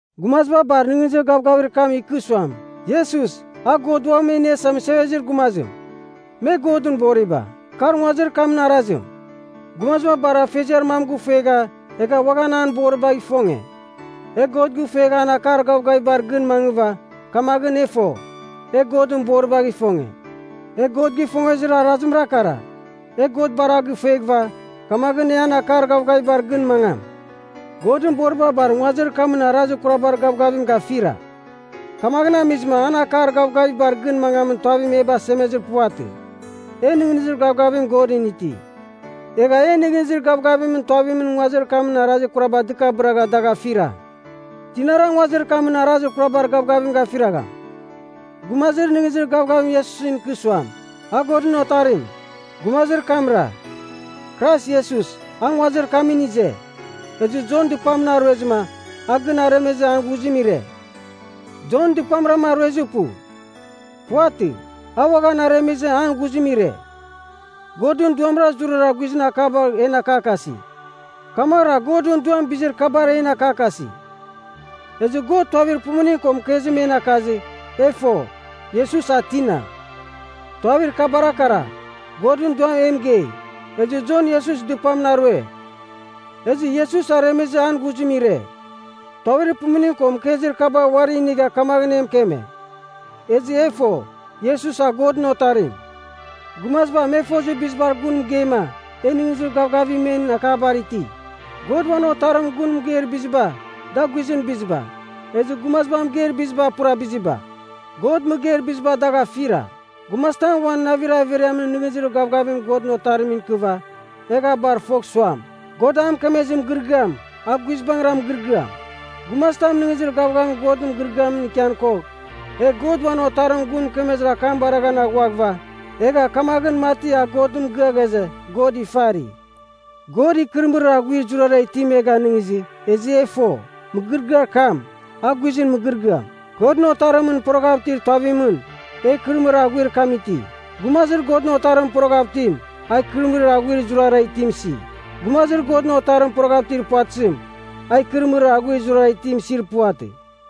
Gumaziba bar nɨghnɨzir gavgavir kam ikɨ suam, Iesus, a God Uam E Iniasa Mɨsevezir Gumazim, me Godɨn boriba. Kar nguazir kamɨn arazim: Gumaziba bar afeziar mam gɨfuegha, egha uaghan an boribagh ifonge. E God gifuegh an akar gavgavibar gɨn mangɨva, kamaghɨn e fo, e Godɨn boribagh ifonge. E God gifongezir arazimra kara. E God bar a gifueghɨva, kamaghɨn e an akar gavgavibar gɨn mangam. Godɨn boriba bar nguazir kamɨn arazir kurabar gavgavim gafira, kamaghɨn amizɨma an akar gavgavibar gɨn mangamin tuavim e basemezir puvatɨ. E nɨghnɨzir gavgavim Godɨn iti. Egha en nɨghnɨzir gavgavimɨn tuavimɨn nguazir kamɨn arazir kuraba dɨkabɨragha dagh afira. Tinara nguazir kamɨn arazir kurabar gavgavim gafiragham? Gumazir nɨghnɨzir gavgavim Iesusɨn ikɨ suam, a Godɨn Otarim. Gumazir kamra. Krais Iesus, a nguazir kamɨn ize. Ezɨ Jon dɨpamɨn a ruezɨma, a gɨn aremezɨ an ghuzim ire. Jon dɨpamra a ruezir pu. Puvatɨ, a uaghan aremezɨ an ghuzim ire. Godɨn Duamra zurara guizɨn akabar en akakasi. Kamaghɨra Godɨn Duam bizir kabar en akakasi. Ezɨ God tuavir pumuning ko mɨkezim en akazɨ, e fo, Iesus a tina. Tuavir kabara kara. Godɨn Duam e mɨgei. Ezɨ Jon Iesus dɨpamɨn a rue. Ezɨ Iesus aremezɨ an ghuzim ire. Tuavir pumuning ko mɨkezir kaba uari inigha kamaghɨn e mɨkeme. Ezɨ e fo, Iesus a Godɨn Otarim. Gumaziba, me fozir bizibar gun mɨgeima, e nɨghnɨzir gavgavim men akabar iti. God uan Otarimɨn gun mɨgeir biziba, da guizɨn biziba, ezɨ gumaziba mɨgeir biziba pura biziba. God mɨgeir biziba dagh afira. Gumazitam uan navir averiamɨn nɨghnɨzir gavgavim Godɨn Otarimɨn ikɨva, egh a bar fogh suam, God a mɨkemezir mɨgɨrɨgɨam, a guizbangɨra mɨgɨrɨgɨam. Gumazitam nɨghnɨzir gavgavim Godɨn mɨgɨrɨgɨamɨn ikian kogh, egh God uan Otarimɨn gun mɨkemezir akam baraghan aghuaghɨva, egha kamaghɨn mati a Godɨn mɨgɨa ghaze, God ifari. God ikɨrɨmɨrir aghuir zurara itim e ganɨngizɨ, ezɨ e fo, mɨgɨrɨgɨar kam, a guizɨn mɨgɨrɨgɨam. Godɨn Otarimɨn poroghav itir tuavimɨn, e ikɨrɨmɨrir aghuir kam iti. Gumazir Godɨn Otarimɨn poroghav itim, a ikɨrɨmɨrir aghuir zurara itim isi. Gumazir Godɨn Otarimɨn poroghav itir puvatɨzim, a ikɨrɨmɨrir aghuir zurara itim isir puvatɨ.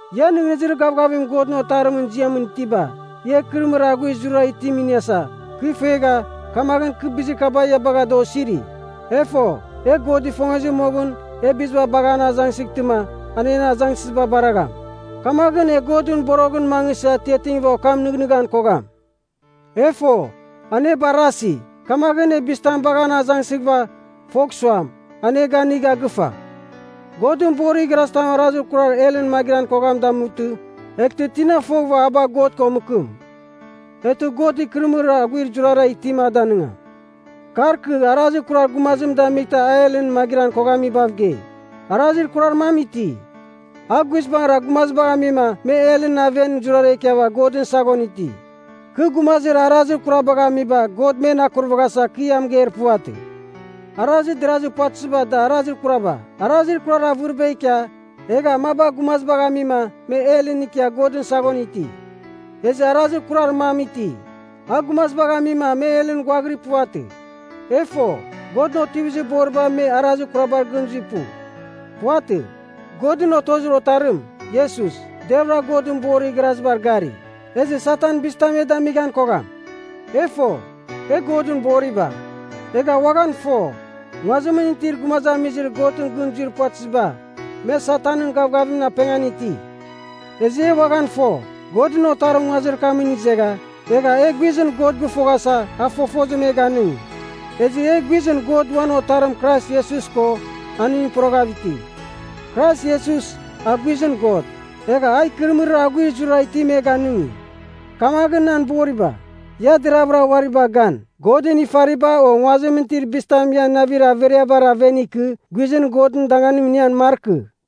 Ia nɨghnɨzir gavgavim Godɨn Otarimɨn ziamɨn itiba, ia ikɨrɨmɨrir aghuir zurara itim iniasa, kɨ fuegha, kamaghɨn kɨ bizir kaba ia bagha da osiri. E fo, e God ifongezir moghɨn, e biziba bagh an azangsɨghtɨma, an en azangsɨziba baragham. Kamaghɨn e Godɨn boroghɨn mangɨsɨ atiatingɨva okam nɨghnɨghan kogham. E fo, an e barasi, kamaghɨn e bizitam bagh an azangsɨghɨva, fogh suam, an e ganigha gɨfa. Godɨn borir igharazitam arazir kurar helɨn magɨran koghamim damutɨ, eghtɨ tina foghɨva a bagh God ko mɨkɨm. Eghtɨ God ikɨrɨmɨrir aghuir zurara itim a danɨngam. Kar kɨ arazir kurar gumazim damightɨma a helɨn magɨran koghamibav gei. Arazir kurar mam iti, a guizbangɨra gumazibagh amima me helɨn aven zurara ikiava Godɨn saghon iti. Kɨ gumazir arazir kurar kabagh amiba God men akurvaghasa kɨ ia mɨgeir puvatɨ. Arazir derazir puvatɨziba da arazir kuraba. Arazir kurar avɨriba ikia, egha maba gumazibagh amima me helɨn ikia Godɨn saghon iti. Ezɨ arazir kurar mam iti, a gumazibagh amima me helɨn ghuaghirir puvatɨ. E fo, Godɨn otivizir boriba me arazir kurabar gɨn zuir pu. Puvatɨ, Godɨn otozir Otarim, Iesus, deravɨra Godɨn borir igharazibar gari. Ezɨ Satan, bizitam me damighan kogham. E fo, e Godɨn boriba. Egha uaghan fo, nguazimɨn itir gumazamizir Godɨn gɨn zuir puvatɨziba, me Satanɨn gavgavimɨn apengan iti. Ezɨ e uaghan fo, Godɨn Otarim nguazir kamɨn izegha, egha e guizɨn God gɨfoghasa, a fofozim e ganɨngi. Ezɨ e, guizɨn God uan Otarim Krais Iesus ko, aningɨn poroghav iti. Krais Iesus, a guizɨn God. Egha a ikɨrɨmɨrir aghuir zurara itim e ganɨngi. Kamaghɨn nan boriba, ia deravɨra uari bagh gan, godɨn ifariba o nguazimɨn itir bizitam ian navir averiabar aven ikɨ guizɨn Godɨn danganim inian markɨ.